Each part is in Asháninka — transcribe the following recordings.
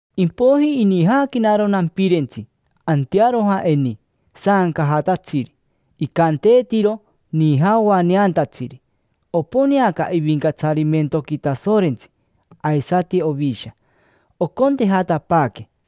Impoiji inijaaquenaro nampirentsi antearoja eni, saancajatatsiri, icanteetiro: nija oaneantatsiri. Oponeaca ivincatsarimentoqui Tasorentsi aisati Ovisha, ocontejatapaaque, chararara.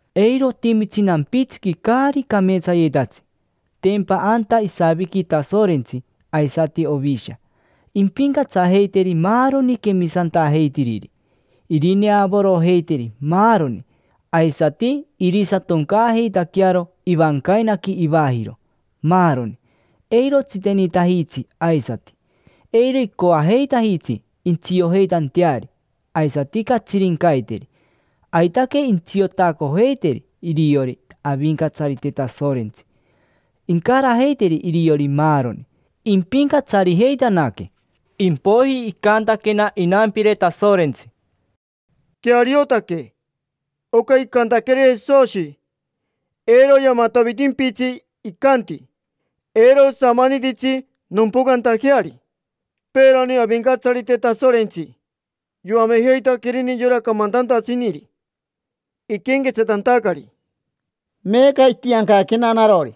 Eiro otimitsi nampitsiqui caari cameetsayetatsi; tempa anta isaviqui Tasorentsi aisati Ovisha. Impincatsajeiteri maaroni quemisantajeitiriri. Irineavorojeiteri maaroni, aisati irisatoncaajeitaquearo ivancainaqui ivajiro, maaroni. Eiro otsitenitajitsi aisati, eiro icoajeitajitsi intsiojeitanteari aisati catsirincaiteri. Aitaque intsiotacojeiteri iriori Avincatsarite Tasorentsi. Incarajeiteri iriori maaroni, impincatsarijeitanaque. Impoiji icantaquena inampire Tasorentsi: —Queariotaque oca icantaqueri Jesoshi, eiro yamatavitimpitsi; icanti: “Eiro osamanititsi nompocantajeari”. Peerani Avincatsarite Tasorentsi yoamejeitaquerini yora camantantatsiniri iquenquetsatantacari. Meeca itiancaquena narori,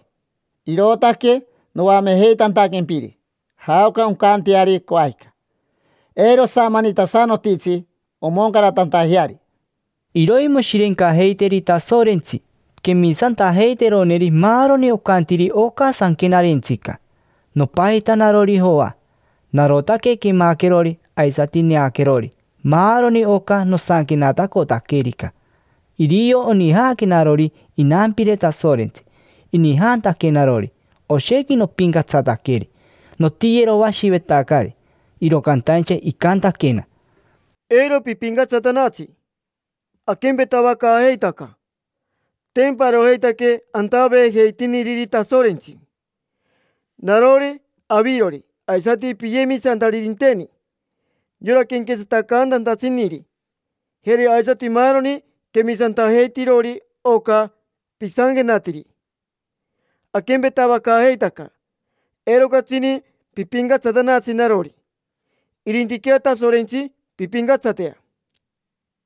irootaque noamejeitantaquempiri jaoca oncanteari coajica: eiro osamanitasanotitsi omoncaratantajeari. Iroimoshirencajeiteri Tasorentsi quemisantajeiteroneri maaroni ocantiri oca sanquenarentsica. Nopajita narori Joa. Narotaque quemaquerori aisati neaquerori maaroni oca nosanquenatacotaquerica. Irio onijaquenarori inampire Tasorentsi. Inijantaquenarori, oshequi nopincatsataqueri, notiyeroashivetacari, iro cantaincha icantaquena: —Eiro pipincatsatanatsi, aquempetavacaajeitaca: tempa arojeitaque antaveejeitiniriri Tasorentsi. Narori, avirori, aisati piyemisantaririnteni, yora quenquetsatacantantatsiniri, jeri aisati maaroni quemisantajeitirori oca pisanquenatiri: aquempetavacaajeitaca. Eiro catsini pipincatsatanatsi narori, irintiquea Tasorentsi pimpincatsatea.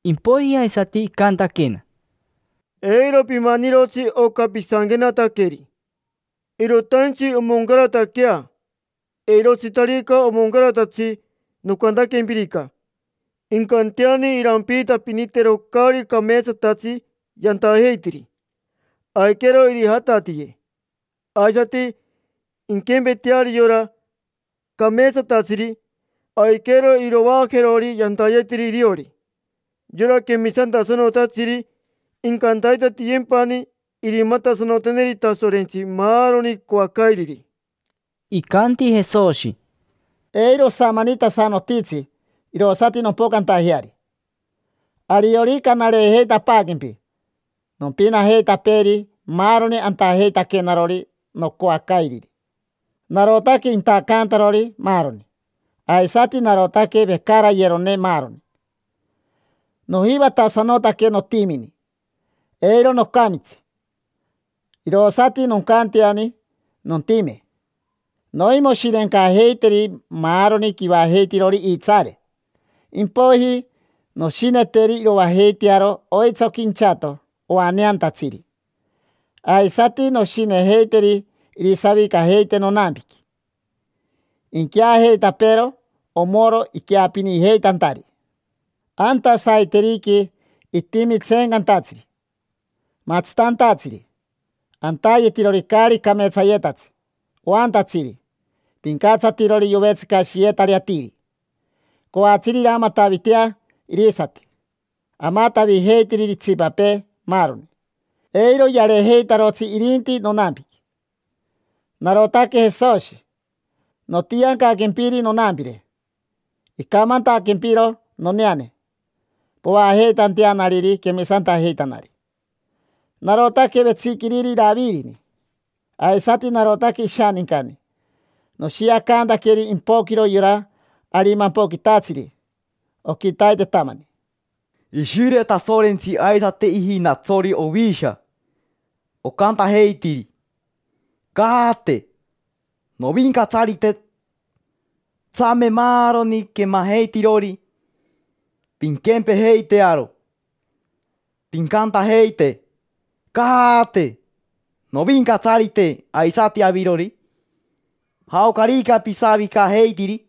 Impoiji aisati icantaquena: —Eiro pimanirotsi oca pisanquenataqueri, irotaintsi omoncarataquea. Eirotsitarica omoncaratatsi nocantaquempirica, incanteani irampiitapinitero caari cameetsatatsi yantajeitiri, aiquero irijatatiye. Aisati inquempeteari yora cameetsatatsiri: aiquero irovaajerori yantayetiri iriori. Yora quemisantasanotatsiri incantaitatiyempani irimatasanoteneri Tasorentsi maaroni icoacairiri. Icanti Jesoshi: —Eiro osamanitasanotitsi irosati nompocantajeari. Ariorica nareejeitapaaquempi, nompinajeitapeeri maaroni antajeitaquenarori nocoacairiri. Narotaque intacantarori maaroni, aisati narotaque vecarayerone maaroni. Nojivatasanotaque notimini, eiro nocamitsi, irosati noncanteani nontime. Noimoshirencajeiteri maaroni quivajeitirori iitsaare, impoiji noshineteri iroajeitearo oitsoqui inchato oaneantatsiri, aisati noshinejeiteri irisavicajeite nonampiqui: inqueajeitapeero omoro iqueapinijeitantari. Anta saiteriqui itimi tseencantatsiri, matsitantatsiri, antayetirori caari cameetsayetatsi, oantatsiri, pincatsatirori yovetsicashiyetari atiri, coatsiri iramatavitea irisati, amatavijeitiriri itsipapee, maaroni. Eiro yareejeitarotsi irinti nonampiqui. Narotaque Jesoshi. Notiancaquempiri nonampire, icamantaquempiro noneane povaajeitanteanariri quemisantajeitanari. Narotaque vetsiquiriri Iravirini, aisati narotaque ishanincani. Noshiacantaqueri impoquiro yora arimampoquitatsiri oquitaitetamani. Ishire Tasorentsi aisati ijinatsori Ovisha, ocantajeitiri: —Caate, Novincatsarite. Tsame maaroni quemajeitirori, pinquempejeitearo, pincantajeite: —Caate, Novincatsarite. Aisati avirori, jaocarica pisavicajeitiri: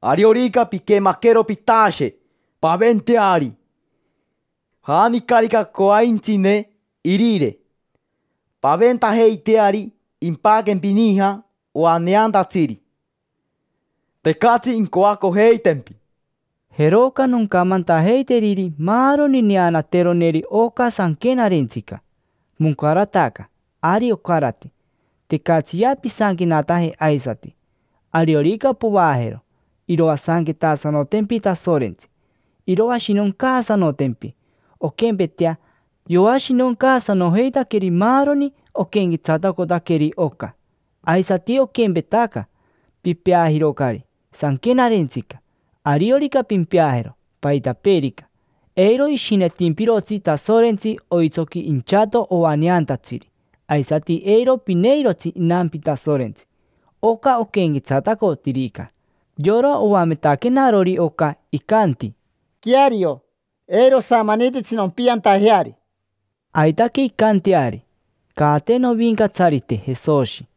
ariorica piquemaquero pitashe, paventeari. Janicarica coaintsine irire, paventajeiteari: impaquempi nija oaneantatsiri, tecatsi incoacojeitempi. Jeroca noncamantajeiteriri maaroni neanateroneri oca sanquenarentsica. Moncarataca, ari ocarati. Tecatsiya pisanquenataje aisati. Ariorica povaajero, iroasanquetasanotempi Tasorentsi: iroashinoncaasanotempi onquempetea yoashinoncaasanojeitaqueri maaroni oquenquetsatacotaqueri oca. Aisati oquempetaca, pipeajirocari sanquenarentsica. Ariorica pimpeajero paitapeerica, eiro ishinetimpirotsi Tasorentsi oitsoqui inchato oaneantatsiri; aisati eiro pineirotsi inampi Tasorentsi, oca oquenquetsatacotirica. Yora oametaquenarori oca icanti: —Queario, eiro osamanititsi nompiantajeari. Aitaque incanteari. Caate Novincatsarite Jesoshi.